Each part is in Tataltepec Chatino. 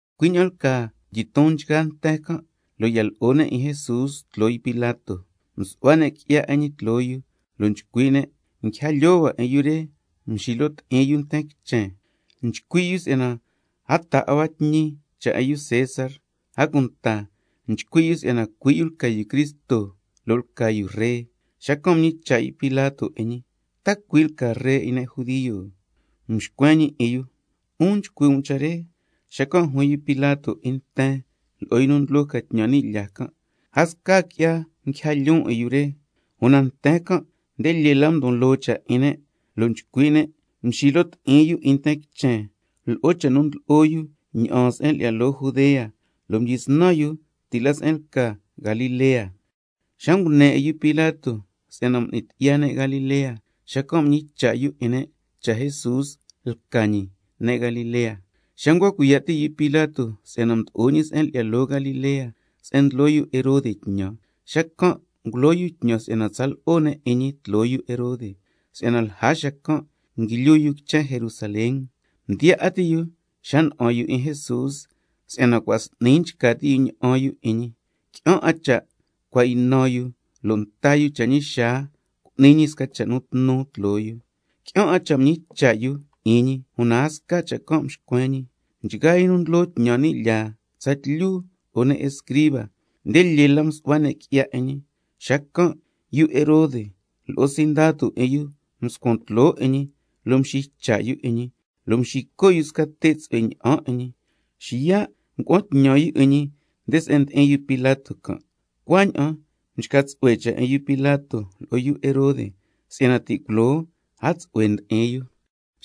Cui' ña'an lcaa mdyiton nchgaa nten can', lo' ya lo'o ne' 'in Jesús tloo yu Pilato. Mdyisnan msu'hua ne' qui'ya 'in ñi tloo yu, lo' nchcui' ne': Nguija lyoo hua 'in yu re nxilo ti'in yu 'in nten quichen, nchcui' yu si'yana a taa 'a hua tñi cha' 'in yu César, a cunta nchcui' yu si'yana cui' yu lca yu Cristo, lo' lca yu ree. Xacan' mñicha' yu Pilato 'in ñi: ¿Ta cui' lca Ree 'in ne' judio? Mxcuen ñi 'in yu: 'Un nchcui' um cha' re. Xacan' juin yu Pilato 'in nten lo'o yu nu ndlo ca tñan ni' lyaa can': A sca qui'ya nguija lyoon 'in yu re. Una nten can' nde lyee la mdon loo cha' 'in ne' lo' nchcui' ne': Nxilo ti'in yu 'in nten quichen lo'o cha' nu ndlo'o yu ña'aan se'en lyi'ya loo Judea, lo' mdyisnan yu ti' la se'en lca Galilea. Xa ngune 'in yu Pilato si'yana m'ni tyi'ya ne' Galilea, xacan' mñicha' yu 'in ne' cha' Jesús lca ñi ne' Galilea. Xa ncua cuiya' ti' yu Pilato si'yana mdo'o ñi se'en lyi'ya loo Galilea se'en ndlo yu Herode tñan, xacan' ngulo yu tñan si'yana tsa lo'o ne' 'in ñi tloo yu Herode, si'yana lja xacan' nguilyu yu quichen Jerusalén. Mdiyaa 'a ti' yu xa na'an yu 'in Jesús, si'yana cua' s'ni nchca ti' yu ña'an yu 'in ñi, qui'an 'a cha' cua' ynan yu lo' nta yu cha' ñi xaa cu'ni ñi sca cha' nu tnu tloo yu. Qui'an 'a cha' mñicha' yu 'in ñi, una a sca cha' can' mxcuen ñi. Nchgaa yu nu ntsu'hui cunta laa 'in ne' tsatlyu lo'o ne' escriba, nde lyee la msu'hua ne' qui'ya 'in ñi. Xacan' yu Herode lo'o sindatu 'in yu mscuan tloo 'in ñi lo' mxiycha' yu 'in ñi, lo' mxico' yu sca te' tsu'hue ña'an 'in ñi, xiya' ngua'an tñan yu 'in ñi nde se'en ndi'in yu Pilato can'. Cuaña'an mchca tsu'hue cha' 'in yu Pilato lo'o yu Herode, si'yana ti' culoo a tsu'hue ndi'in yu.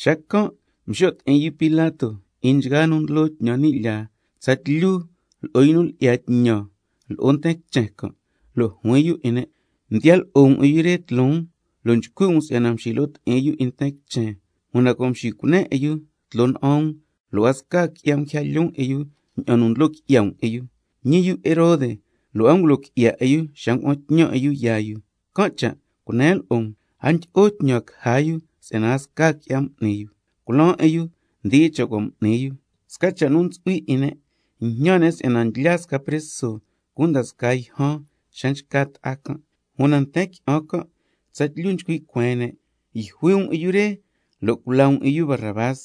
Xacan' mxo' ti'in yu Pilato 'in nchgaa nu ndlo tñan ni' lyaa, tsatlyu lo'o yu nu lyi'ya tñan lo'o nten quichen can', lo' juin yu 'in ne': Mdiyan lo'o um 'in yu re tloon lo' nchcui' um si'yana nxilo ti'in yu nten quichen, una cua' mxicunen 'in yu tloo na'an um, lo' a sca qui'ya nguija lyoon 'in yu ña'an nu ndlo qui'ya um 'in yu. Ñi yu Herode, lo' a ngulo qui'ya 'in yu xa ngua'an tñan 'in yu yaa yu. Can' cha' cunen lo'o um, a ndyi'o tñan caja yu si'yana a sca qui'ya m'ni yu. Culaan 'in yu ndi'a xa cua' m'ni yu. Sca cha' nu ntsu'hui 'in ne', njñan ne' si'yana ndlyaa sca preso cunda scaa yjan xa nchca ta'a can'. Una nten qui'an can' tsatlyu nchcui' cueen ne': ¡Yjui um 'in yu re lo' culaa um 'in yu Barrabás!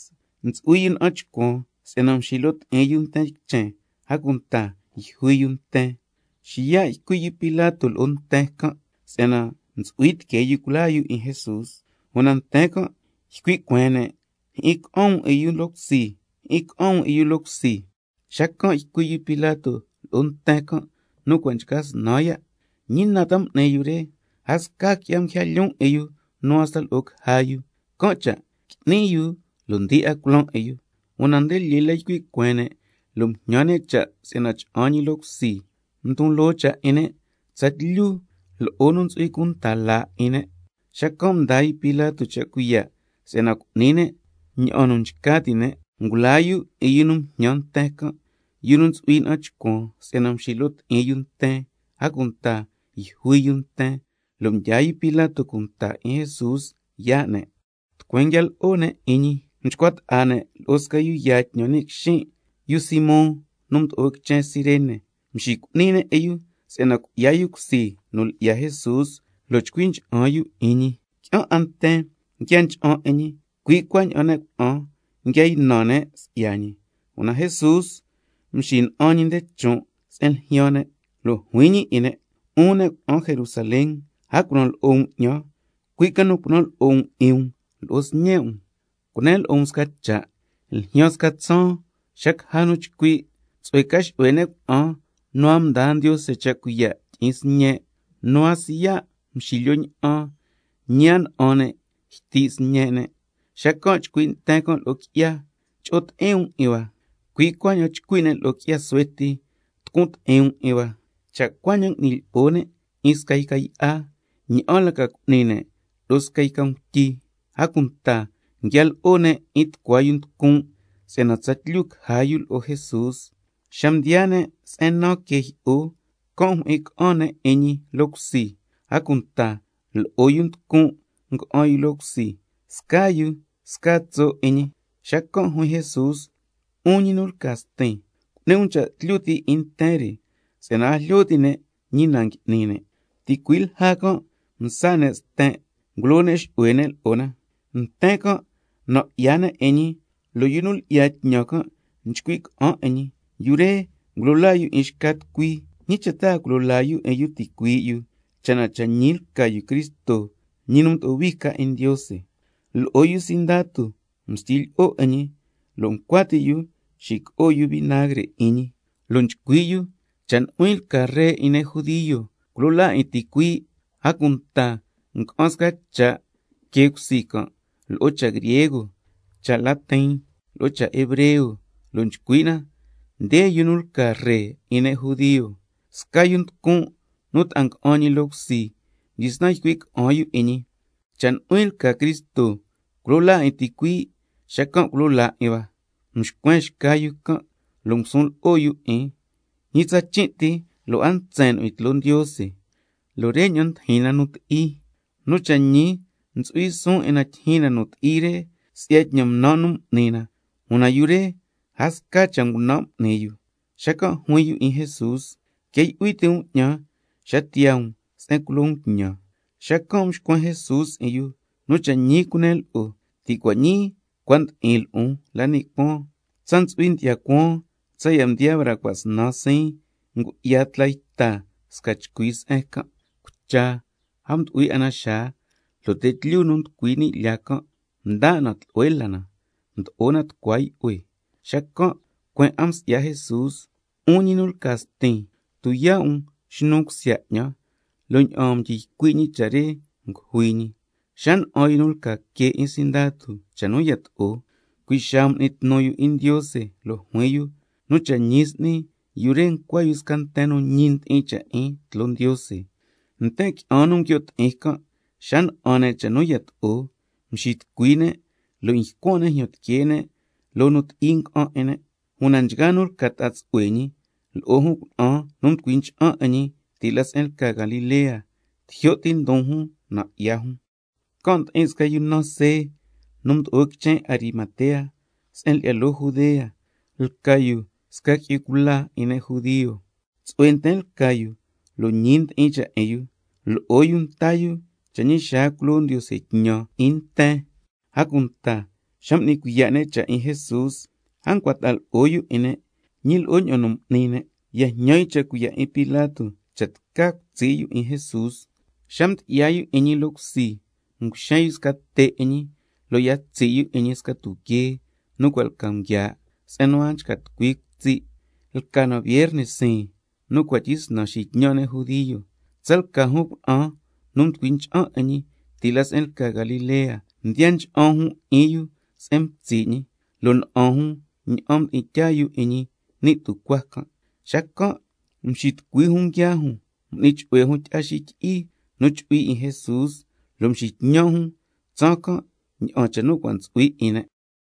Ntsu'hui yu na'an chcuan si'yana mxilo ti'in yu nten quichen, a cunta yjui yu nten. Xiya' ycui' yu Pilato lo'o nten can' si'yana ntsu'hui tiquee yu culaa yu 'in Jesús. Una nten can' ycui' cueen ne': ¡Jyi'in ca'an um 'in yu loo cusi, jyi'in ca'an um 'in yu loo cusi! Xacan' ycui' yu Pilato lo'o nten can' nu cua' nchca snan ya': ¿Ñi na ta m'ni yu re? A sca qui'ya nguija lyoon 'in yu nu hasta lo'o caja yu. Can' cha' qui'ni yu lo' ndi'a culaan 'in yu. Una nde lyee la ycui' cueen ne' lo' mjñan ne' cha' si'yana cha'an ñi loo cusi. Mdon loo cha' 'in ne' tsatlyu lo'o nu ntsu'hui cunta laa 'in ne'. Xacan' mdaa yu Pilato cha' cuiya' si'yana cu'ni ne' ña'an nu nchca ti' ne'. Ngulaa yu 'in yu nu mjñan nten can', yu nu ntsu'hui na'an chcuan si'yana mxilo ti'in yu nten, a cunta yjui yu nten, lo' mdyaa yu Pilato cunta 'in Jesús yaa' ne'. Tucueen nguia lo'o ne' 'in ñi mchcua ta'a ne' lo'o sca yu yaa tñan ni' quixin', yu Simón nu mdo'o quichen Cirene, mxicu'ni ne' 'in yu si'yana cui'ya yu cusi nu lyi'ya Jesús lo' chcui cha'an yu 'in ñi. Qui'an 'a nten nguia ncha'an 'in ñi, cui' cuaña'an ne' cuna'an nguia ynan si'ya ñi. Una Jesús mxina'an ñi nde chon' se'en ljyaan ne', lo' juin ñi 'in ne': 'Un ne' cuna'an Jerusalén, a cunan lo'o um 'ñan, cui' ca nu cunan lo'o um 'in um lo'o sñe' um. Cunen lo'o um sca cha', ljyaan sca tsaan xa caja nu chcui': Tsu'hue ca xu'hue ne' cuna'an nu a mdaa Ndiose cha' cuiya' tyi'in sñe', nu a siya' mxilyo ña'an, ñi a na'an ne' yti' sñe' ne'. —Xacan' chcui' nten can' lo'o qui'ya: Cho'o ti'in um 'in hua, cui' cuaña'an chcui' ne' lo'o qui'ya suhue ti: Tucun ti'in um 'in hua—. Cha' cuaña'an ngui'ni lyi'o ne' 'in sca yca yi'a, ña'an la ca cu'ni ne' lo'o sca yca ngutyi. A cunta nguia lo'o ne' 'in tucua yu nducun' si'yana tsatlyu caja yu lo'o Jesús. Xa mdiyaa ne' se'en naan que jyi'o, can' mjyi'in ca'an ne' 'in ñi loo cusi, a cunta lo'o yu nducun' nga'an yu loo cusi, scaa yu sca tso' 'in ñi. Xacan' juin Jesús: 'Un ñi nu lca Stin, cu'ni um cha' tlyu ti' 'in nten re si'yana a jlyo ti' ne' ñi na ngui'ni ne'. —Ticui' lja can' mtsa ne' sten', ngulo ne' xu'hue ne' lo'o na—. Nten can' nan' 'ya ne' 'in ñi, lo' yu nu lyi'ya tñan can' nchcui' ca'an 'in ñi: Yu re ngulo laa yu 'in xca tucui, ¿ñi cha' a culo laa yu 'in yu cha' na cha' ñi ca lca yu Cristo, ñi nu mdo'o hui ca 'in Ndiose? Lo'o yu sindatu mstyi lyi'o 'in ñi, lo' ncua ti' yu xico'o yu vinagre 'in ñi, lo' nchcui' yu: Cha' nu'huin lca Ree 'in ne' judio, culo laa 'in ticuii'. A cunta nga'an sca cha' que cusi can' lo'o cha' griego, cha' latin, lo'o cha' hebreo, lo' nchcui' na: Nde yu nu lca Ree 'in ne' judio. Sca yu nducun' nu ta'a nga'an ñi loo cusi mdyisnan ycui' ca'an yu 'in ñi: Cha' nu'huin lca Cristo, culo laa 'in ticuii', xacan' culo laa 'in hua. Mxcuen xca yu can' lo' ngusun lo'o yu 'in: Ñi tsachin' ti lo' a ntsen nu'huin tloo Ndiose, lo' re ña'an ndijin na nu ti'i. Nu cha' ñi ntsu'hui suun 'in na tyijyin na nu ti'i re, si'ya tñan ngunan' nu m'ni na, una yu re a sca cha' ngunan' m'ni yu. Xacan' juin yu 'in Jesús: Quia yu'hui ti' um 'ñan xa tiyaa um se'en culo um tñan. Xacan' mxcuen Jesús 'in yu: Nu cha' ñi cunen lo'o, ti' cua' ñii cua' ndi'in lo'on la ni' cuaan. Tsa ntsu'hui ndyi'ya cuaan tsaya' mdiyaa braa cua' snan siin, ngu'ya tla yta sca chcui se'en can'. Cucha a mdu'hui 'a na xaa, lo' te' tlyu nu nducui la ni' lyaa can' mda' na tlu'hue la na, mdo'o na tucua yu'hue. Xacan' cueen 'a msi'ya Jesús: 'Un ñi nu lca Stin, —tuyaa' um xnun cusya 'ñan—, lo' ña'aan mdyi ycui' ñi cha' re ngujui ñi. Xa na'an yu nu lca que 'in sindatu cha' nu yato'o, cui' xaa m'ni tnu yu 'in Ndiose lo' juin yu: Nu cha' ñi s'ni, yu re ncua yu sca nten nu ñi ndi'in cha' 'in tloo Ndiose. Nten qui'an nu nguio' ti'in can' xa na'an ne' cha' nu yato'o, mxitucui ne' lo' mycuan' ne' jyan tiquee ne' loo nu ti'i nga'an 'in ne'. Una nchgaa nu lca ta'a tsu'hue ñi lo'o jun cuna'an nu mducui ncha'an 'in ñi ti' la se'en lca Galilea, tijyo' ti ndon jun nan' 'ya jun. Can' ndi'in sca yu naan See nu mdo'o quichen Arimatea se'en lyi'ya loo Judea, lca yu sca qui'yu cula 'in ne' judio, tsu'hue nten lca yu lo' ñi ndi'in cha' 'in yu. Lo'o yu nta yu cha' ñi xaa culo Ndiose tñan 'in nten, a cunta xa m'ni cuiya' ne' cha' 'in Jesús a ncua ta'a lo'o yu 'in ne', ñi lo'o ña'an nu m'ni ne'. Ya jñan yu cha' cuiya' 'in Pilato cha' tca cutsi' yu 'in Jesús. Xa mdyi'ya yu 'in ñi loo cusi nguxen yu sca te' 'in ñi, lo' ya tsi' yu 'in ñi sca tuquee nu cua' lca nguiaa', se'en nu a nchca tucui quitsi'. Lca na vierne siin nu cua' tyisnan xitñan' ne' judio. Tsalca jun cuna'an nu mducui ncha'an 'in ñi ti' la se'en lca Galilea, mdiya ncha'an jun 'in yu se'en mtsi' ñi, lo' na'an jun ña'an mdi'in tyaa yu 'in ñi ni' tucuaa can'. Xacan' mxitucui jun nguiaa jun, m'ni chu'hue jun tyi'a xityi'i nu chu'hui 'in Jesús, lo' mxitñan' jun tsaan can' ña'an cha' nu cua' ntsu'hui 'in ne'.